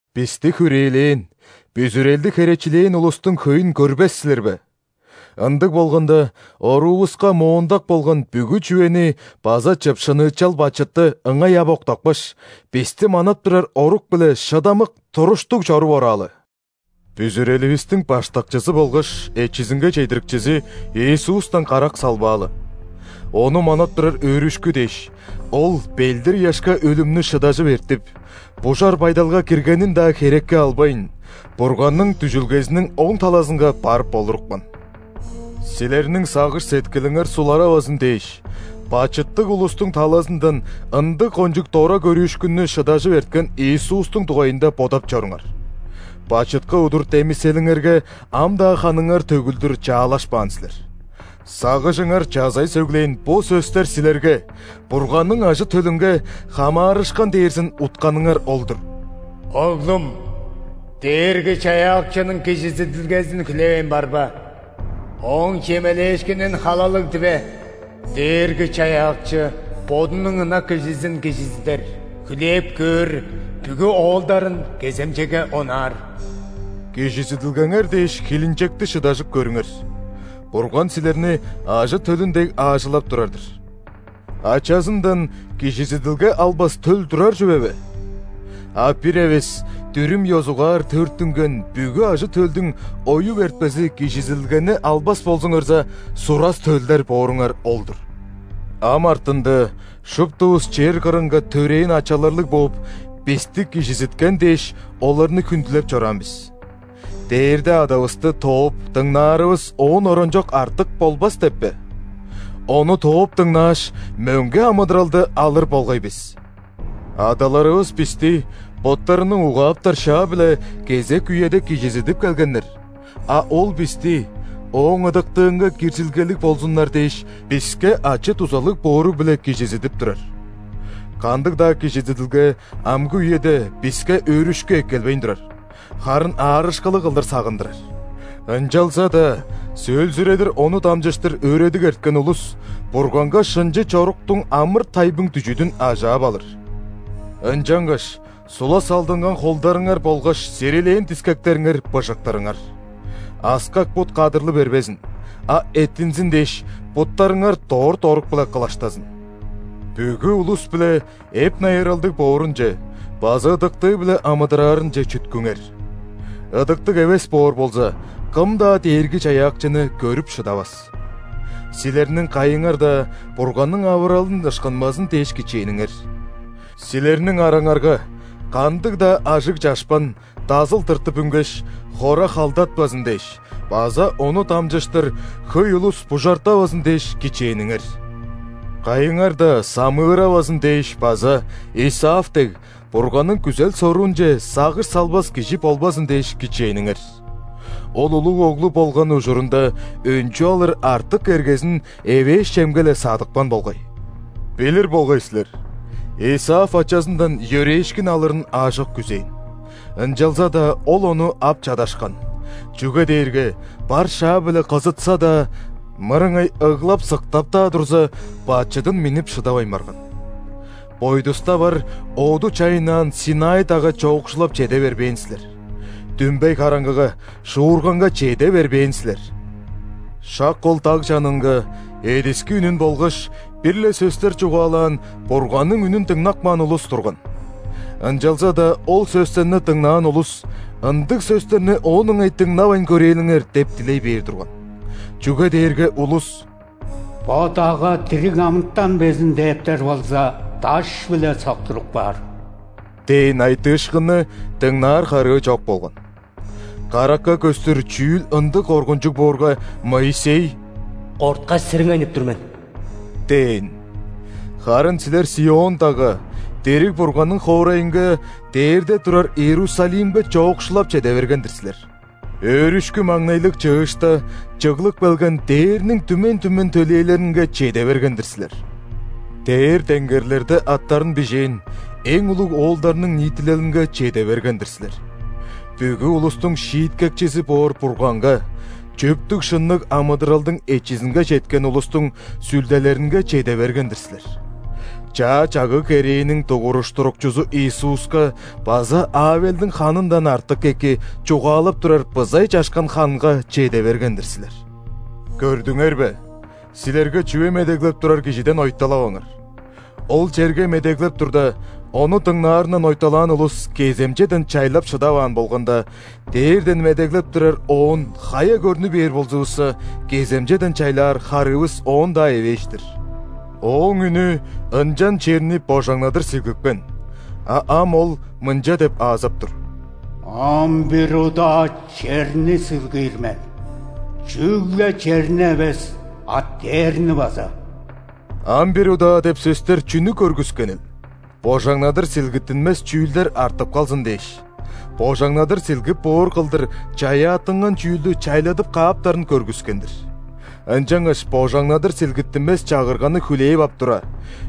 Бисти хүрээлээн, бүзүрелди херечилээн улустуң хөйүн көрбес силер бе?! Ындыг болганда, оруувуска моондак болган бүгү чүвени база чыпшыныычал бачытты ыңай ап октапкаш, бисти манап турар орук-биле шыдамык, туруштуг чоруп ораалы. Бүзүреливистиң Баштакчызы болгаш Эчизинге чедирикчизи Иисустан карак салбаалы. Ону манап турар өөрүшкү дээш, Ол ·белдир-ыяшка өлүмнү шыдажып эртип, бужар байдалга киргенин-даа херекке албайн, Бурганның дүжүлгезиниң оң талазынга барып олурупкан. Силерниң сагыш-сеткилиңер суларавазын дээш, бачыттыг улустуң талазындан ындыг кончуг дора көрүүшкүннү шыдажып эрткен Иисустуң дугайында бодап чоруңар. Бачытка удур демиселиңерге ам-даа ханыңар төгүлдүр чаалашпаан силер. Сагыжыңар чазай сөглээн бо сөстер силерге, Бурганның ажы-төлүнге, хамаарышкан дээрзин утканыңар ол-дур:«Оглум, Дээрги-Чаяакчының кижизидилгезин хүлээвейн барба,Ооң чемелээшкинин халалыг диве. Дээрги-Чаяакчы Бодунуң ынак кижизин кижизидер,хүлээп көөр бүгү оолдарын кеземчеге онаар». Кижизидилгеңер дээш, хилинчекти шыдажып көрүңер. Бурган силерни ажы-төлүн дег аажылап турар-дыр. Ачазындан кижизидилге албас төл турар чүве бе? А бир эвес дүрүм ёзугаар төрүттүнген бүгү ажы-төлдүң оюп эртпези кижизидилгени албас болзуңарза, сурас төлдер бооруңар ол-дур. Ам артында шуптувус чер кырынга төрээн ачаларлыг бооп, бисти кижизиткен дээш, оларны хүндүлеп чораан бис. Дээрде Адавысты тооп дыңнаарывыс оон оранчок артык болбас деп бе?! Ону тооп дыңнааш, мөңге амыдыралды алыр болгай бис! Адаларывыс бисти боттарының угааптар шаа-биле кезек үеде кижизидип келгеннер, а Ол бисти, Ооң ыдыктыынга киржилгелиг болзуннар дээш, биске ачы-дузалыг боору-биле кижизидип турар. Кандыг-даа кижизидилге амгы үеде биске өөрүшкү эккелбейн турар, харын аарышкылыг кылдыр сагындырар. Ынчалза-даа сөөлзүредир ону дамчыштыр өөредиг эрткен улус Бурганга шынчы чоруктуң амыр-тайбың дүжүдүн ажаап алыр. Ынчангаш сула салдынган холдарыңар болгаш сирилээн дискектериңер быжыктырыңар. Аскак бут кадырлы бербезин, а эттинзин дээш, буттарыңар дорт орук-биле кылаштазын. Бүгү улус-биле эп-найыралдыг боорунче база ыдыктыы-биле амыдыраарынче чүткүңер. Ыдыктыг эвес боор болза, кым-даа Дээрги-Чаяакчыны көрүп шыдавас. Силерниң кайыңар-даа Бурганның авыралын ышкынмазын дээш кичээниңер. Силерниң араңарга кандыг-даа ажыг чашпан дазыл тыртып үнгеш, хора халдатпазын дээш база ону дамчыштыр хөй улус бужартавазын дээш кичээниңер. Кайыңар-даа самыыравазын дээш база, Исав дег, Бурганның күзел-соруунче сагыш салбас кижи болбазын дээш кичээниңер. Ол улуг оглу болган ужурунда өнчү алыр артык эргезин эвээш чемге-ле садыпкан болгай. Билир болгай силер: Исав ачазындан йөрээшкин алырын аажок күзээн. Ынчалза-даа ол ону ап чадашкан, чүге дээрге бар шаа-биле кызытса-даа, мырыңай ыглап-сыктап-даа турза, бачыдын миннип шыдавайн барган. Бойдуста бар, оду чайыннаан ·Синай дагга чоокшулап чеде бербээн силер; дүмбей караңгыга, шуурганга чеде бербээн силер. Шак ол даг чанынга эдиски үнүн болгаш бир-ле сөстер чугаалаан Бурганның үнүн дыңнап каан улус турган. Ынчалза-даа ол сөстерни дыңнаан улус: «Ындыг сөстерни оон ыңай дыңнавайн көрээлиңер» – деп дилей бээр турган. Чүге дээрге улус: «Бо дагга дириг амытан безин дээптер болза, даш-биле соктуруп каар» – дээн айтыышкынны дыңнаар харыы чок болган. Каракка көстүр чүүл ындыг коргунчуг боорга, Моисей: «Корткаш, сириңейнип тур мен» – дээн. Харын силер ·Сион дагга, дириг Бурганның хоорайынга, дээрде турар Иерусалимге чоокшулап чеде берген-дир силер. Өөрүшкү-маңнайлыг чыышта чыглып келген дээрниң түмен-түмен төлээлеринге чеде берген-дир силер. Дээр-деңгерлерде аттарын бижээн эң улуг оолдарның ниитилелинге чеде берген-дир силер. Бүгү улустуң Шииткекчизи боор Бурганга, чөптүг-шынныг амыдыралдың эчизинге четкен улустуң сүлделеринге чеде берген-дир силер. Чаа чагыг-керээниң Дугуруштурукчузу Иисуска база Авелдиң ханындан артык эки чугаалап турар бызай чашкан ханга чеде берген-дир силер. Көрдүңер бе, силерге чүве медеглеп турар Кижиден ойталаваңар. Ол черге медеглеп турда, Ону дыңнаарындан ойталаан улус кеземчеден чайлап шыдаваан болганда, дээрден медеглеп турар Оон хая көрнү бээр болзувусса, кеземчеден чайлаар харыывыс оон-даа эвээш-тир. Ооң үнү ынчан черни божаңнадыр силгипкен, а ам ол мынча деп аазап тур:«Ам бир удаа черни силгиир мен, чүгле черни эвес, а дээрни база». «Ам бир удаа» деп сөстер чүнү көргүскенил? Божаңнадыр силгиттинмес чүүлдер артып калзын дээш, божаңнадыр силгип боор кылдыр чаяаттынган чүүлдү чайладып кааптарын көргүскен-дир. Ынчангаш божаңнадыр силгиттинмес Чагырганы хүлээп ап тура,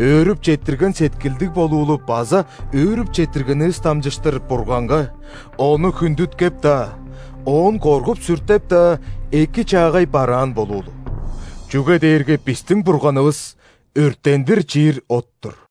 өөрүп четтирген сеткилдиг болуулу база өөрүп четтиргенивис дамчыштыр Бурганга, Ону хүндүткеп-даа, Оон коргуп-сүртеп-даа, эки-чаагай бараан болуулу. Чүге дээрге бистиң Бурганывыс – өрттендир чиир от-тур.